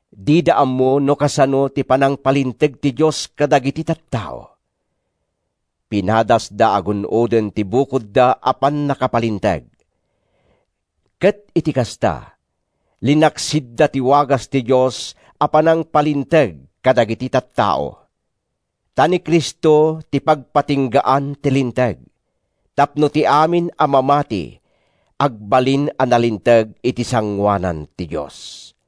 Dida ammo no kasano ti panangpalinteg ti Dios kadagiti tattao. Pinadasda a gun-oden ti bukodda a pannakapalinteg, ket iti kasta, linaksidda ti wagas ti Dios a panangpalinteg kadagiti tattao. Ta ni Cristo ti pagpatinggaan ti Linteg, tapno ti amin a mamati agbalin a nalinteg iti sangoanan ti Dios.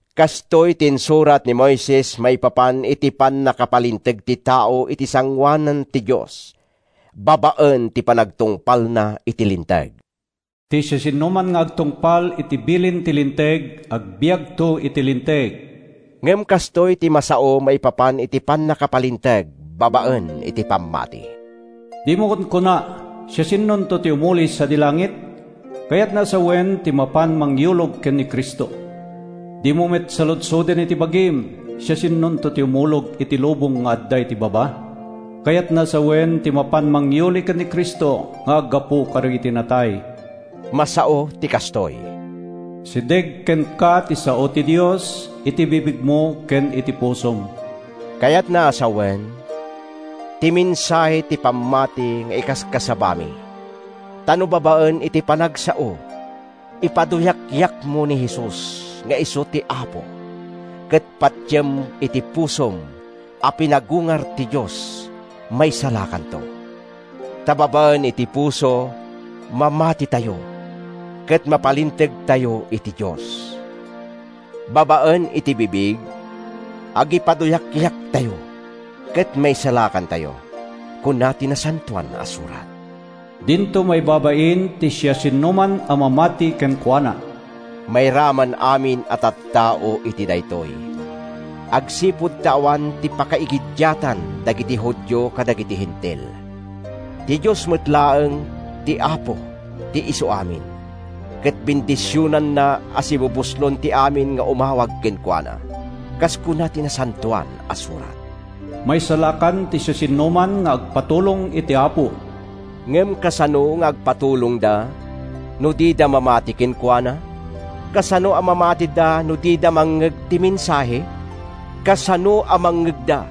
Kastoy ti insurat ni Moises maipapan iti pannakapalinteg ti tao iti sangoanan ti Dios babaen iti panagtungpalna iti Linteg: “Ti siasinoman nga agtungpal iti bilin ti Linteg, agbiagto iti Linteg.” Ngem kastoy ti masao maipapan iti pannakapalinteg babaen iti pammati: “Dimo kunkuna, ‘Siasinonto ti umuli sadi langit?’” (Kayatna a sawen, ti mapan mangyulog ken ni Cristo.) “Dimo met saludsoden iti bagim, ‘Siasinonto ti umulog iti lubong nga adda iti baba?’” (Kayatna a sawen, ti mapan mangyuli ken ni Cristo nga aggapu kadagiti natay.) Masao ti kastoy: “Asideg kenka ti sao ti Dios, iti bibigmo ken iti pusom”—kayatna a sawen, ti mensahe ti pammati nga ikaskasabami. Ta no babaen iti panagsao, ipaduyakyakmo ni Jesus nga isu ti Apo, ket patiem iti pusom a pinagungar ti Dios, maisalakankanto. Ta babaen iti puso, mamatitayo, ket mapalintegtayo iti Dios. Babaen iti bibig, agipaduyakyaktayo, ket maisalakantayo. Kuna ti Nasantoan a Surat, “Dinto maibabain ti siasinoman a mamati kenkuana.” Mairaman amin a tattao iti daytoy, agsipud ta awan ti pakaigiddiatan dagiti Judio kadagiti Hentil. Ti Dios met laeng ti Apo ti isuamin, ket bendisionanna a sibubuslon ti amin nga umawag kenkuana. Kas kuna ti Nasantoan a Surat, “Maisalakan ti siasinoman nga agpatulong iti Apo.” Ngem kasano nga agpatulongda, no dida mamati kenkuana? Kasano a mamatida no dida mangngeg ti mensahe? Kasano a mangngegda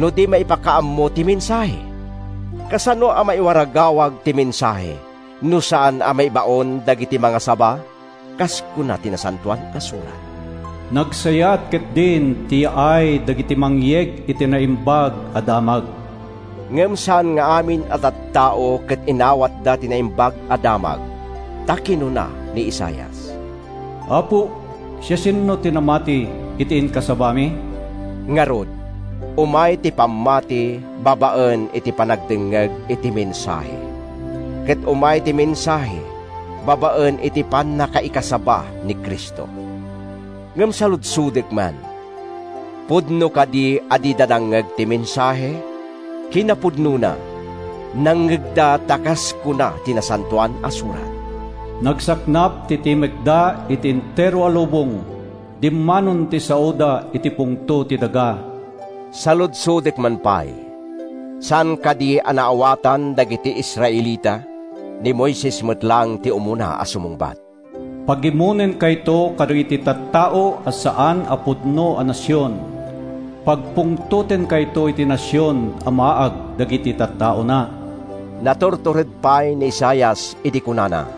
no di maipakaammo ti mensahe? Kasano a maiwaragawag ti mensahe, no saan a maibaon dagiti mangasaba? Kas kuna ti Nasantoan a Surat, “Nagsayaat ketdin ti yaay dagiti mangyeg iti naimbag a damag!” Ngem saan nga amin a tattao ket inawatda ti Naimbag a Damag. Ta kinuna ni Isaias, “Apo, siasino ti namati iti inkasabami?” Ngarud, umay ti pammati babaen iti panagdengngeg iti mensahe, ket umay ti mensahe babaen iti pannakaikasaba ni Cristo. Ngem saludsodek man: Pudno kadi a dida nangngeg ti mensahe? Kinapudnona, nangngeg-da ta kas kuna ti Nasantoan a Surat: “Nagsaknap ti timekda iti entero a lubong, Dimmanon ti saoda iti pungto ti daga.” Saludsodek man pay: Saan kadi a naawatan dagiti Israelita? Ni Moises met laeng ti umuna a sumungbat: “Pagimonenkayto kadagiti tattao a saan a pudno a nasion; Pagpungtotenkayto iti nasion a maag dagiti tattaona.” Naturtured pay ni Isaias idi kunana,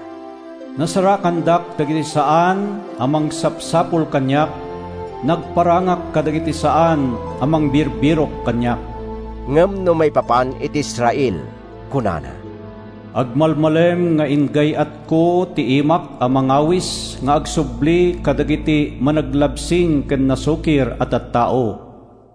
“Nasarakandak dagiti saan a mangsapsapul kaniak, nagparangak kadagiti saan a mangbirbirok kaniak.” Ngem no maipapan iti Israel, kunana, “Agmalmalem nga igay-atko ti imak a mangawis nga agsubli kadagiti managlabsing ken nasukir a tattao.”